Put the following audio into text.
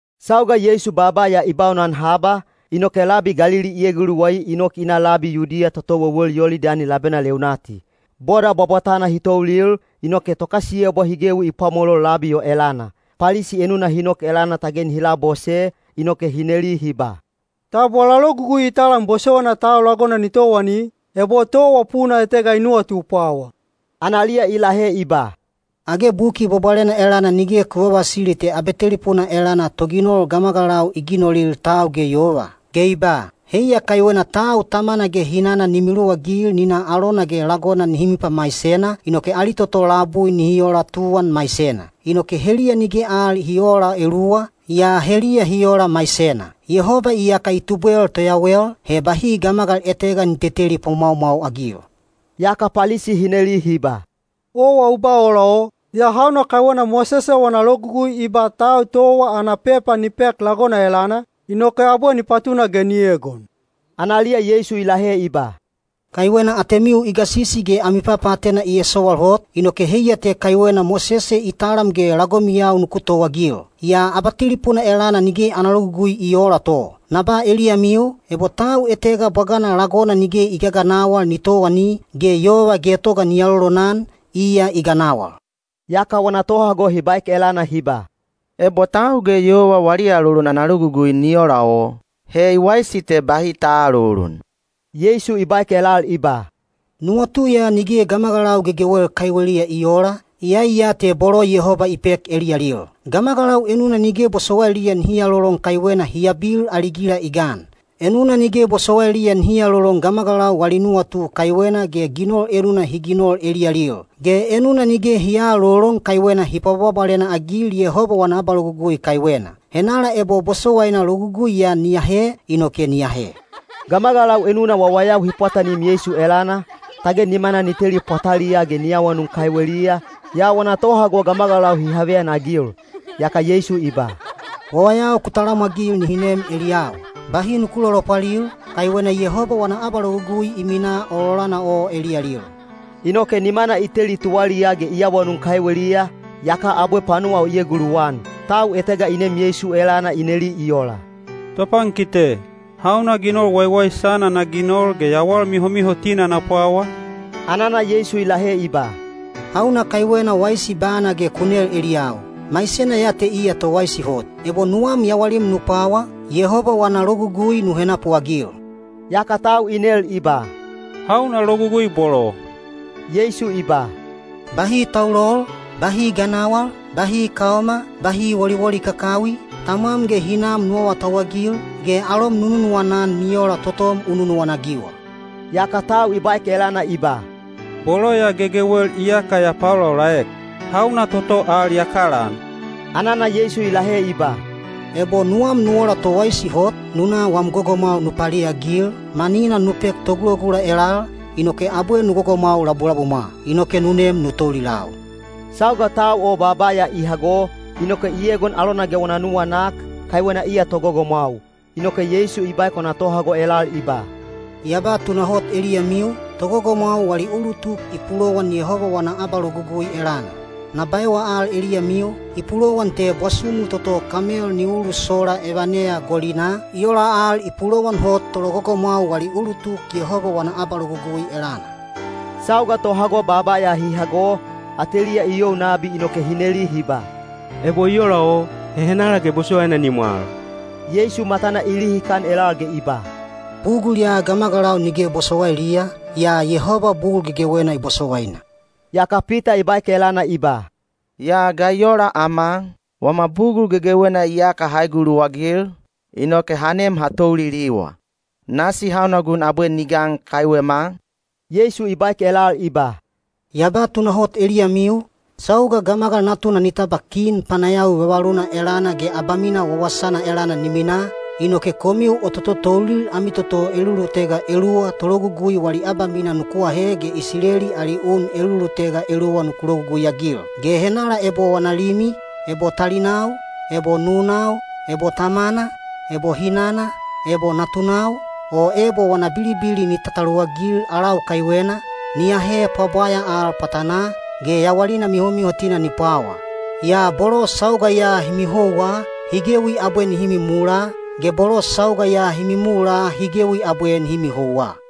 Sauga Yeisu baaba ya i baunan haba, inoke labi Galili i eguluwai i nok i na labi Yudiya toto wewel Yolidani labena leunati. Boda bwabwatana hi toulil, inoke tokasiyebwa hi gewi i pwamolol labi o elana. Palisi enuna hi nok elana tage nihi labose, inoke hi neli hi ba, “Tab wala logugui i talam bosowaina tau lagona ni towani, ebo towa puna etega i nuwatu pwawa?” Analiya i lahe i ba, “Age Buki Bwabwalena elana nige ku vavasili te abatelipuna elana Toginol ‘gamagalau i ginolil tau ge yova’? Ge i ba, ‘Heiya kaiwena tau tamana ge hinana ni miluwagil ni na alona ge lagona nihi mipamaisena, inoke ali toto labui nihi ola tuwan maisena.’ Inoke heliya nige al hi oola eluwa, yaa heliya hi ola maisena. Yehoba iyaka i tubwel toyawel, he bahi gamagal etega ni teteli pwamwaumwau-agil.” Yaka Palisi hi neli hi ba, “Owa u ba ola o, yaa hauna kaiwena Mosese wana logugui i ba tau towa ana pepa ni pek lagona elana, inoke abwe ni patuna ge ni egon?” Analiya Yeisu i lahe i ba, “Kaiwena atemiu i gasisi ge ami papaatena i esowal hot, inoke heiya te kaiwena Mosese i talam ge lagomiyau nuku towaagil. Yaa abatelipuna elana nige ana logugui i oola to. Na ba eliyamiu, ebo tau etega bwagana lagona nige i gaganawal ni towani, ge yova getoga ni alolonan, iya i ganawal.” Yaka wana tohago hi baek elana hi ba, “Ebo tau ge yova wali alolon ana logugui ni ola o, he i waisi te bahi ta aalolon.” Yeisu i baek elal i ba, “Nuwatu ya nige gamagalau gegewel kaiweliya i oola, iyai ya te bolo Yehoba i pek eliyalil. Gamagalau enuna nige bosowailiya nihi alolon kaiwena hi abil ali gila i gan. Enuna nige bosowailiya nihi alolon gamagalau wali nuwatu kaiwena ge ginol enuna hi ginol eliyalil. Ge enuna nige hi aalolon kaiwena hi pwabwabwalena-agil Yehoba wana abalogugui kaiwena. Henala ebo bosowaina logugui ya ni ahe, inoke ni ahe.” Gamagalau enuna wawayau hi pwatanim Yeisu elana, tage nimana ni teli pwataliyaa ge ni awanun kaiweliya, yaa wana tohago gamagalau hi haveyanagil. Yaka Yeisu i ba, “Wawayau ku talamwagil nihi nem eliyau, bahi nuku lolopwalil, kaiwena Yehoba wana abalogugui i minaa ololana o eliyalil.” Inoke nimana i teli tuwaliyaa ge i awanun kaiweliya, yaka abwe panuwa o i eguluwan. Tau etega i nem Yeisu elana i neli i ola, “Topankite, hauna ginol waiwaisana na ginol ge yawal mihomihotina na pwawa?” Anana Yeisu i lahe i ba, “Hauna kaiwena waisi bana ge u nel eliyau? Maisena ya te iya towaisi hot. Ebo nuwam yawalim nu pwawa, Yehoba wana logugui nu henapuagil.” Yaka tau i nel i ba, “Hauna logugui bolo?” Yeisu i ba, “Bahi taulol, bahi ganawal, bahi kaoma, bahi woliwoli kakawi, tamwam ge hinam nu awatauwagil, ge alom nu nunuwana-an ni ola totom u nunuwana-agiwa.” Yaka tau i baek elana i ba, “Bolo ya gegewel iyaka ya paolaolaek. Hauna toto al ya kalaan?” Anana Yeisu i lahe i ba, “Ebo nuwam nu ola towaisi hot, nu na wam gogomwau nu paliagil, manina nu pek togulagula elal, inoke abwe nu gogomwau labulabumwa. Inoke nu nem nu toulilau.” Sauga tau o baaba ya i hago, inoke i egon alona ge wana nuwanak, kaiwena iya togogomwau. Inoke Yeisu i baek wana tohago elal i ba, “Ya ba tunahot eliyamiu, togogomwau wali ulutuk i pulowan Yehoba wana abalogugui elana. Na baewa al eliyamiu, i pulowan te bwasumu toto kamel ni ulusola evaneya golinaa, i ola al i pulowan hot tologogomwau wali ulutuk Yehoba wana abalogugui elana.” Sauga tohago baaba ya hi hago, ateliya i you nabi inoke hi neli hi ba, “Ebo i ola o, he henala ge bosowaina ni mwal?” Yeisu matana i lihikan elal ge i ba, “Bugul ya gamagalau nige bosowailiya, yaa Yehoba bugul gegewena i bosowaina.” Yaka Pita i baek elana i ba, “Yaa ga i ola ama? Wama bugul gegewena iyaka ha eguluwagil, inoke ha nem ha touliliwa. Nasi hauna gun abwe ni gan kaiwema?” Yeisu i baek elal i ba, “Ya ba tunahot eliyamiu, sauga Gamagal Natuna ni tabwa kin panayawi vavaluna elana ge abamina wawasana elana ni minaa, inoke komiu o tototoulil ami toto elulutega eluwa tologugui wali abamina nuku ahe ge Isileli ali un elulutega eluwa nuku logugui-agil. Ge henala ebo wana limi, ebo talinau, ebo nunau, ebo tamana, ebo hinana, ebo natunau, o ebo wana bilibili ni tataluwagil alau kaiwena, ni ahe pwabwaya al pwatanaa, ge yawalina mihomihotina ni pwawa. Yaa bolo sauga ya hi mihouwa, hi gewi abwe nihi mimula, ge bolo sauga ya hi mimula hi gewi abwe nihi mihouwa.”